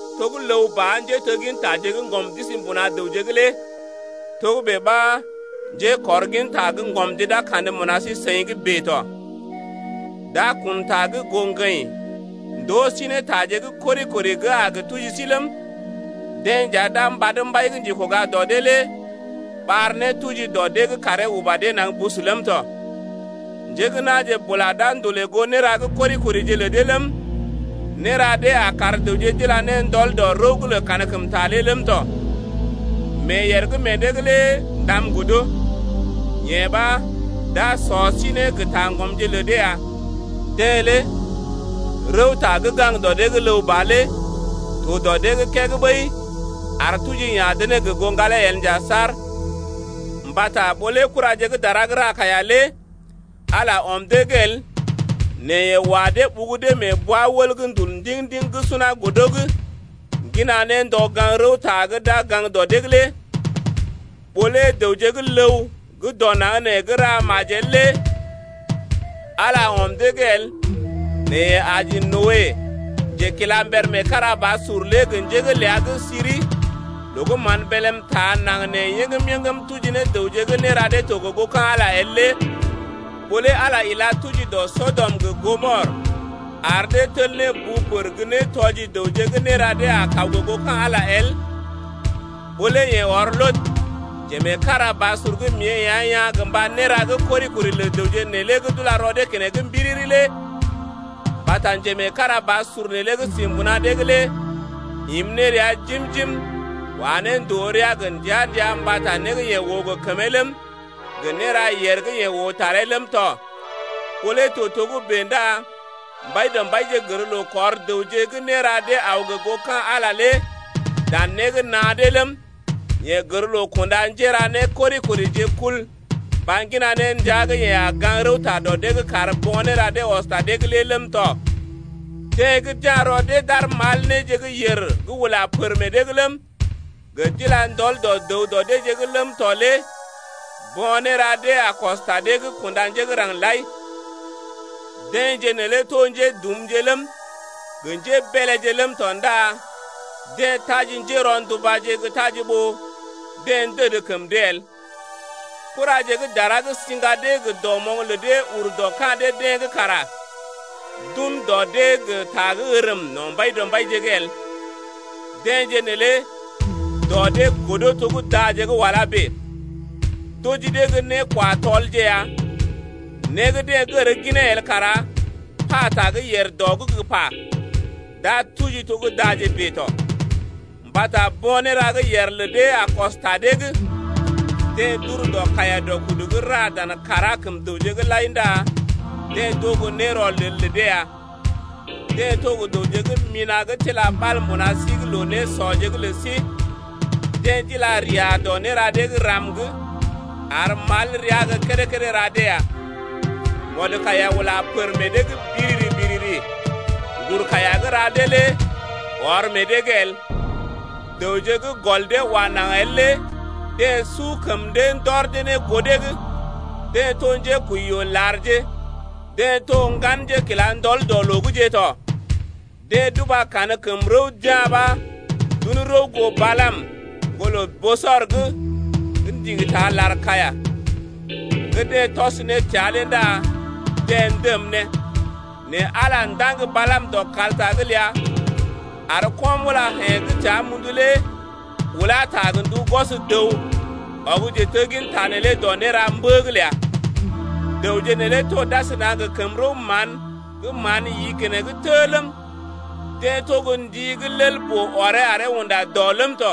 To gə́ ləw ba, njéteggintaje gə́ ŋgɔm d’isi mbuna dəwje’g lé togə́bè ɓa njékɔrginta gə́ ŋgɔmje d’a kandə mbuna sí-seḭ’g bèe tɔ. D’a kun ta gə goo ŋgəḭ ndoo sí ne taje gə́ kori-kori gə́ a gə tuji sí ləm, deḛ nja d’a mbad mbai gə́ njekoga dɔ dee lé ɓar ne tuji dɔ dee’g karee uba dee naŋg bus ləm tɔ. Njé gə́ na̰je bula d’a ndolè goo néra gə́ kori-korije lə dee ləm, néra dee a kar dəwje d’ila ne ndɔl dɔ kankəm rəw’g lé ləm tɔ. Meeyèr gə́ meḛ dee’g lé ndam godo, yee ɓa, d’a sɔ sí ne gə taŋgɔmje lə dee ya. Deḛ lé gaŋg rəwta dɔ dee’g ləw ba lé to dɔ dee’g keg ɓəi ar tuji ya̰ dee ne gə goo ŋgalee el nja saar. Mbata ɓó lé kuraje gə́ dara gə́ ra kaiya lé Ala ɔm dee’g el, nɛ yeḛ wa dee ɓugu dee mee bwa-wəl gə́ ndul ndiŋ-ndiŋ gə́ suna godo’g ŋgina ne ndɔ gaŋg rəwta gə́ d’a gə gaŋg dɔ dee’g lé, ɓó lé dəwje gə́ ləw gə́ dɔ naŋg nee gə́ ra majel lé Ala ɔm dee’g el nɛ yeḛ aji Noe, njekilamber meekarabasur lé gə njé’g ləa gə́ siri loo gə́ mán bélm taa naŋg nee yəŋgəm-yəŋgəm tuji ne dəwje gə́ néra dee to gə goo ka̰ Ala el lé, ɓó lé Ala ila tuji dɔ Sɔdɔm gə Gɔmɔr ar dee tel ne bu pər gə́ nétɔji dəwje gə́ néra dee a kaw gə goo ka̰ Ala el, ɓó lé yeḛ ɔr Lɔt, njemeekarabasur gə́ mée ea̰ yaa̰ gə mba néra dee gə́ kori-kori lə dəwje neelé gə́ d’ula rɔ dee keneŋ mbiriri lé (mbata njemeekarabasur neelé gə́ si mbuna dee’g lé im ne rəa jim-jim wa ne ndòo rəa gə ndəa-ndəa mbata né gə́ yeḛ oo gə kəmee ləm, gə néra yèr gə́ yeḛ oo taree ləm tɔ,) ɓó lé to togə́bè ndá Mbaidɔmbaije gər loo kɔr dəwje gə́ néra dee aw gə goo ka̰ Ala dan né gə́ naa dee ləm, yeḛ gər loo kunda njéra nékori-korije kul mba ŋgina ne ndəa gə́ yeḛ a gaŋg rəwta dɔ dee’g kar bo̰ néra ɔs ta dee’g lé ləm tɔ. Deḛ gə́ d’ya̰ rɔ dee d’ar mal néje gə́ yèr gə́ ula pər meḛ dee’g ləm, gə d’ila ndɔl dɔ dəw dɔ deeje’g ləm tɔ lé bo̰ néra dee a kɔs ta dee’g kunda njé gə́ raŋg lai. Deḛje neelé to njédumje ləm, gə njébeeleje ləm tɔ ndá deḛ taji njérɔndubaje gə́ taji ɓó deḛ ndəd kəm dee el. Kuraje gə́ dara gə́ siŋga dee gə dɔmoŋ lə dee ur dɔ ka̰ dee-deḛ’g kara d’un dɔ dee gə ta gə́ ərm no̰ Mbaidɔmbaije’g el. Deḛje neelé dɔ dee godo to gə́ daje gə́ wala bèe, d’oji dee gə́ né-kwa-tɔlje ya, né gə́ deḛ gər ginee el kara pata gə́ yèr dɔ’g gə́ pa, d’a tuji to gə́ daje bèe tɔ. Mbata bo̰ néra gə́ yèr lə dee a kɔs ta dee’g. Deḛ d’ur dɔ kaiya-dɔ-kudu’g ra dan kàrá kəm dəwje’g lai ndá deḛ d’oo gə́ nérɔlel lə dee ya, deḛ to dəwje gə́ mina̰ gə́ tila ɓal mbuna sí’g loo-nésɔje’g lə sí, deḛ d’ilaria dɔ néra dee gə́ ram’g, ar mal rəa gə́ kédé-kédé ra dee ya. Mɔdkaiya ula pər meḛ dee’g biriri-biriri, ŋgur kaiya gə́ ra dee lé ɔr meḛ dee’g el, dəwje gə́ gɔl dee wa naŋg el lé deḛ su kəm dee ndɔr dee ne goo dee’g, deḛ to njékwəiyoolarje, deḛ to ŋgan njékilandɔl dɔ loo’gje tɔ. Deḛ d’uba kankəm rəw d’ya̰ ɓa d’un rəw goo Balaam, ŋgolə Bosɔr’g gə́ ndigi ta lar-kaiya gə́ deḛ tɔs ne təa lé ndá deḛ ndəm ne. Nɛ Ala ndaŋg Balaam dɔ kalta’g ləa, ar ko̰-mulayḛ̀je gə́ təa mundu lé ulá ta gə ndu gwɔs dəw, ɔg njetegginta neelé dɔ néra mbə’g ləa. Dəwje neelé to d’asəna gə kəm-rəw-mán gə́ mán yi keneŋ tə ləm, deḛ to gə́ ndi gə́ lel-boo ɔree aree unda dɔ ləm tɔ,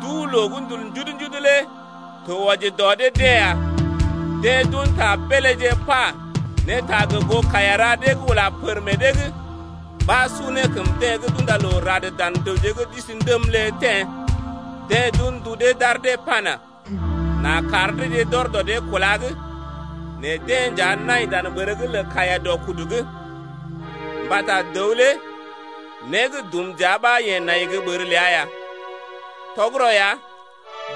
duu-loo gə́ ndul njudu-njudu lé to wɔji dɔ dee-deḛ ya. Deḛ d’un ta beeléje pa ne ta gə goo kaiya ra dee gə́ ula pər meḛ dee’g ɓa su ne kəm deḛ gə́ d’unda loo rad dan dəwje gə́ d’isi ndəm lé teḛ ya. Deḛ d’un ndu dee d’ar dee pana: N’a kar deeje d’ɔr dɔ dee kúla’g, nɛ deḛ nja nai dan ɓər’g lə kaiya-dɔ-kudu’g, mbata dəw lé né gə́ dum dəa ɓa yeḛ nai gə́ ɓər ləa ya. Tɔgərɔ ya,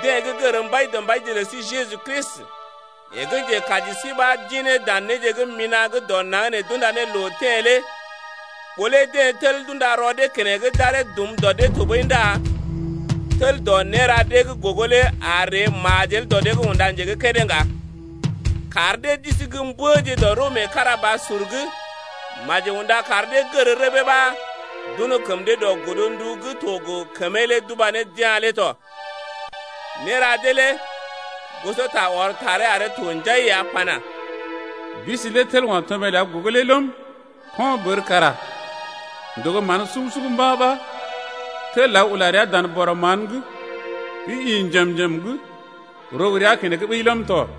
deḛ gə́ gər Mbaidɔmbaije lə sí Jeju Kristi, yeḛ gə́ Njekaji sí ɓa d’ḭ ne dan néje gə́ mina̰ gə́ dɔ naŋg nee d’unda ne loo teḛ lé ɓó lé deḛ tel d’unda rɔ dee keneŋ d’aree dum dee tɔɓəi ndá tel dɔ néra dee gə́ gogo lé a ree majel dɔ dee’g unda nje gə́ kédé ŋga. Kar dee d’isi gə́ mbəje dɔ rəw meekarabasur’g maji unda kar dee gər rəbee ɓa d’un kəm dee goo godndu gə́ to gə kəmee d’ubá ne d’yá̰ lé tɔ. Néra dee lé gosota ɔr taree aree to njai ya pana: Bisi lé tel o̰ tɔmé ləa gogo lé ləm, ko̰ bər kara ndogo mán sugu-sugu mba̰ ɓa tel aw ula rəa dan bɔrɔ mán’g gə́ ḭ njem-njem’g rogo rəa keneŋ ɓəi ləm tɔ.